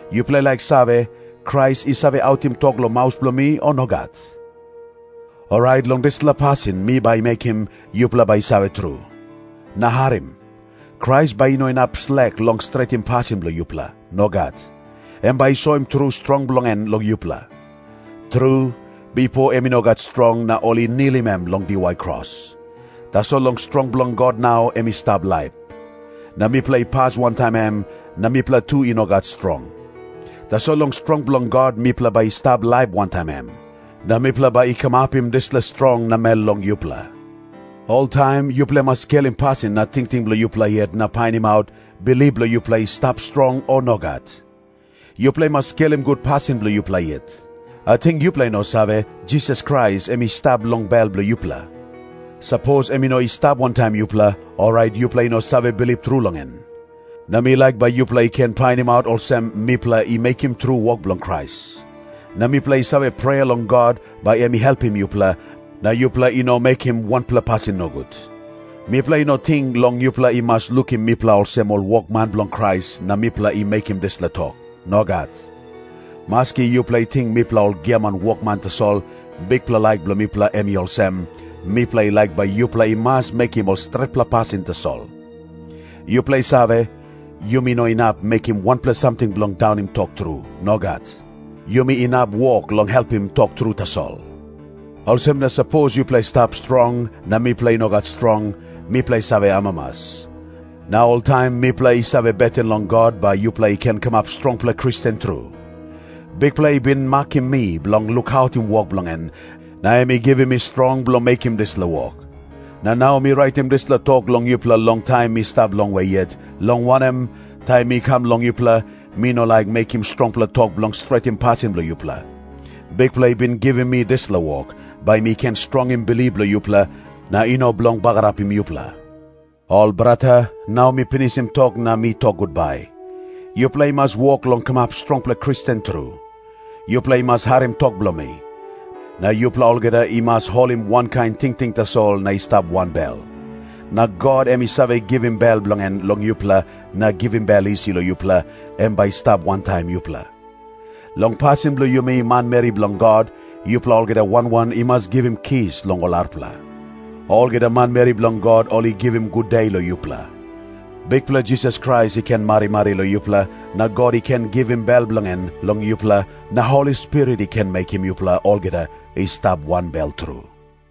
Yupela i laik save, Krais i save autim tok long maus bilong mi, o nogat? Orait long dispela pasin mi bai mekim, yupela bai i save tru. Na harim. Krais bai i no inap slek long stretim pasin bilong yupela. Nogat. Em bai i soim tru strong bilong en long yupela. Tru, bipo em i no gat strong na ol i nilim em long diwai kros. Tasol long strong bilong God nau em i stap laip. Na mipela i pas wantaim em na mipela tu i no gat strong. Tasol long strong bilong God mipela bai i stap laip wantaim em. Na mipela bai i kamapim dispela strong namel long yupela. Oltaim yupela i mas skelim pasin na tingting bilong yupela yet na painimaut, bilip bilong yupela i stap strong, o nogat. Yupela i mas skelim gut pasin bilong yupela yet. Ating yupela i no save, Jisas Krais em i stap long bel bilong yupela? Sapos em i no i stap wantaim yupela, orait yupela i no save bilip tru long en. Na mi laik bai yupela i ken painimaut olsem, mipela i mekim tru wok bilong Krais. Na mipela i save prea long God, bai em i helpim yupela, na yupela i no mekim wanpela pasin nogut. Mipela i no ting long yupela i mas lukim mipela olsem ol wokman bilong Krais, na mipela i mekim dispela tok. Nogat. Maski yupela i ting mipela ol giaman wokman tasol, bikpela laik bilong mipela em i olsem, mipela i laik bai yupela i mas mekim ol stretpela pasin tasol. Yupela i save, yumi no inap mekim wanpela samting bilong daunim tok tru. Nogat. Yumi inap wok long helpim tok tru tasol. Olsem na sapos yupela i stap strong, na mipela i no gat strong, mipela i save amamas. Na oltaim mipela i save beten long God, bai yupela i ken kamap strongpela Kristen tru. Bikpela i bin makim mi bilong lukautim wok bilong en, na em i givim mi strong bilong mekim dispela wok. Na nau mi raitim dispela tok long yupela long taim mi stap longwe yet, long wanem, taim mi kam long yupela, mi no laik mekim strongpela tok bilong stretim pasin bilong yupela. Bikpela i bin givim mi dispela wok, bai mi ken strongim bilip bilong yupela, na i no bilong bagarapim yupela. Ol brata, nau mi pinisim tok na mi tok gutbai. Yupela i mas wok long kamap strongpela Kristen tru. Yupela i mas harim tok bilong mi. Na yupela olgeta i mas holim wankain tingting tasol na i stap wanbel. Na God, em i save givim bel bilong en long yupela na givim bel isi long yupela, em bai i stap wantaim yupela. Long pasin bilong yumi manmeri bilong God, yupela olgeta wan wan i mas givim kis long ol arapela. Olgeta manmeri bilong God ol i givim gude long yupela. Bikpela Jisas Krais i ken marimari long yupela, na God i ken givim bel bilong en long yupela, na Holi Spirit i ken mekim yupela olgeta i stap wanbel tru.